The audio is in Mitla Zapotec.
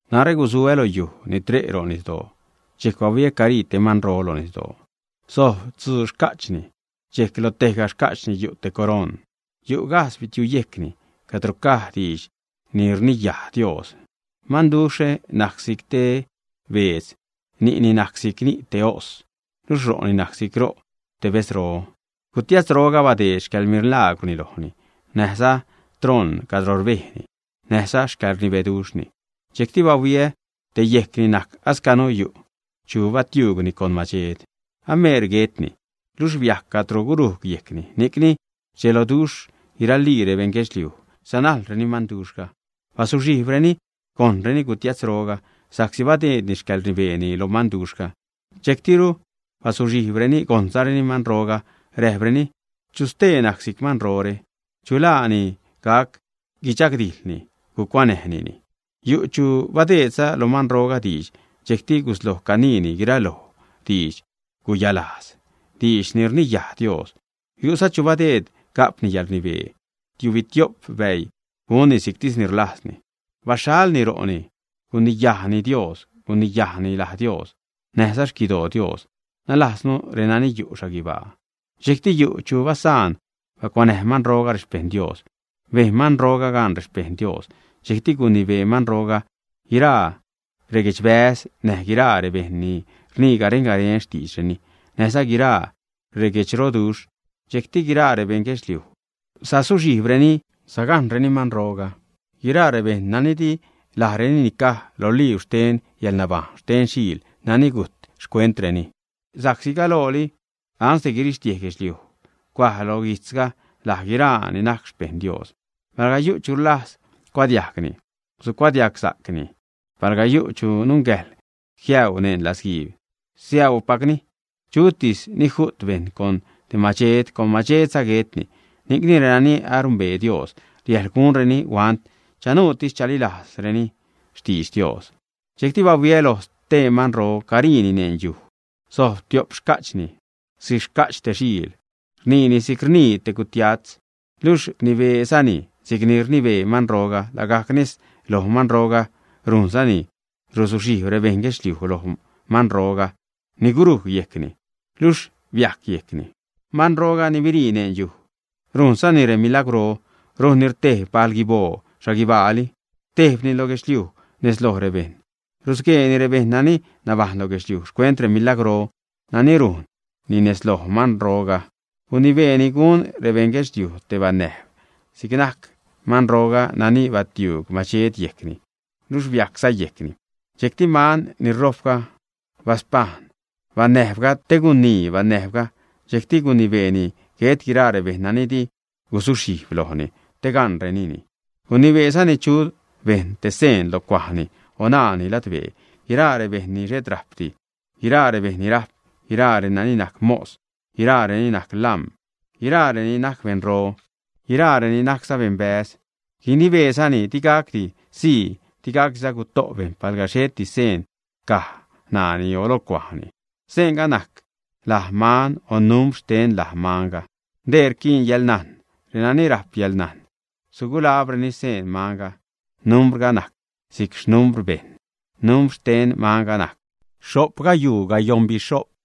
Narä gusuä lo yujxh ni tre' ro' nisdoo, dxejc bahuiä carii te manro lo nisdoo. Sojb tzuu xca'chni. Dxejc lo tejga xca'chni yu' te coroṉ. Yu' gajdz bitiuyejcni cadro caj diidx ni rniyaj Dios. Manduxhre najc si'c te beedz, ni'ni najc si'c ni' te os, luxh ro'ni najc si'c ro' te bedzro. Gutiatzroga badeed xcäḻmilaagwrni lojni, näjza troṉ cadro rbejni, näjza xcäḻrnibeduxhni. Dxejcti bahuiä te yejcni najc ascanu yu' chu batiuugni con madxed, ameer guetni, luxh biajc cadro gurujg yejcni. Ni'cni rdxeloduxh guiralii rebejṉ guedxliuj, sanajlreni manduxhga. Bazuxhijbreni gojṉreni gutiatzroga sa'csi badeedni xcäḻrnibeeni lo manduxhga, dxejctiru bazuxhijbreni gojṉzareni manroga, räjpreni: ―¿Chu stee najc si'c manrore, ä? ¿Chu laa ni gac guichagdijḻni, gucuanäjnini? Yu' chu badeedza lo manroga diidx dxejcti gusloj caniini guiraloj didx-guyalajz, diidx ni rniyaj Dios. Yu'za chu badeed ga'pni yäḻrnibee tiubitio'p bäii, gunni si'ctis ni rlajzni. Baxhalni ro'ni, guniyaduxhni Dios, guniyajni laj Dios, näjza xquidoo Dios, nalajznu renani yu' xhaguibaa. Dxejcti yu' chu basaan bacuanäj manroga rexpejṉ Dios. Bejn manroga gaan rexpejṉ Dios, dxejcti gunibee manroga guiraa reguedxbäz, näj guiraa rebejṉ ni rnii garen-garen xtiidxreni, näjza guiraa reguedxroduxh. Dxejcti guiraa rebeṉ guedxliuj sazuxhijbreni, sagajṉreni manroga, guiraa rebejṉ nani di lajreni nicaj lo libr xten yäḻnabajṉ xten Xiil nani gujt xcuentreni, sa'csi galooli guirixtiej guedxliuj cuaj lo guijtzre laj guiraa ni gac xpejṉ Dios. Palga yu' chu rlajz cuadiajgni, sugucuadiagsa'cni. Palga yu' chu nungäjḻ jiäuu neṉ latzguiib, siäuupacni. Chutis ni ju't te bejṉ con te madxed, con madxedza guetni. Ni'cni renani anumbee Dios, riäjḻ gunreni huant, chanuutis chalilazsa'creni xtidx Dios. Dxejcti bahuiä loj stee manro, cariini neṉ yuj. Sojb tio'p xca'chni si'c xca'ch te xiil, rniini si'c rnii te gutiatz. Luxh rnibeezani si'cni rnibee manroga lagajc nez loj manroga, rujnzani rusuxhijb rebeṉ guedxliuj loj manrogalooga ni gurujc yejcni, luxh biajc yejcni. Manroga ni birii neṉ yuj rujnzani remilagwrro, rujnni rtejb bal-guiboo xhaguibaali, rtejbni lo guedxliuj nez loj rebejṉ. Rusgueeni rebejṉ nani nabajṉ lo guedxliuj xcuent remilagwrro nani rujnni nez loj manrogalooga. Guinibeeni gun rebeṉ guedxliuj te banäjb si'c najc manroga nani batiuug madxed yejcni, luxh biajcza yejcni. Dxejcti man ni rojpga baspajṉ banäjbga te guinii banäjbga, dxejcti gunibeeni guet guiraa rebejṉ nani di guzuxhijb lojni te gaṉrenini. Gunibeezani chu bejṉ te seen lo cuajni o ṉaani ladbee, guiraa rebejṉ ni xhet rajpdi, guiraa rebejṉ ni rajp, guiraa reni najc mos, guiraa reni najc lam̲, guiraa reni najc beṉro, guiraa reni najcza beṉbäz. Gunibeezani digacdi sii, digacdiza guto' bejṉ palga xhet seendi caj ṉaani o lo cuajni. Seenga najc laj manga o numbr xten laj manga. Dee rquiin yäḻnajn. Renani rajp yäḻnajn sugulabreni xseen manga, numbrga najc si'c xnumbr bejṉ; numbr xten manga najc xho'p gayuu gayoṉbixho'p.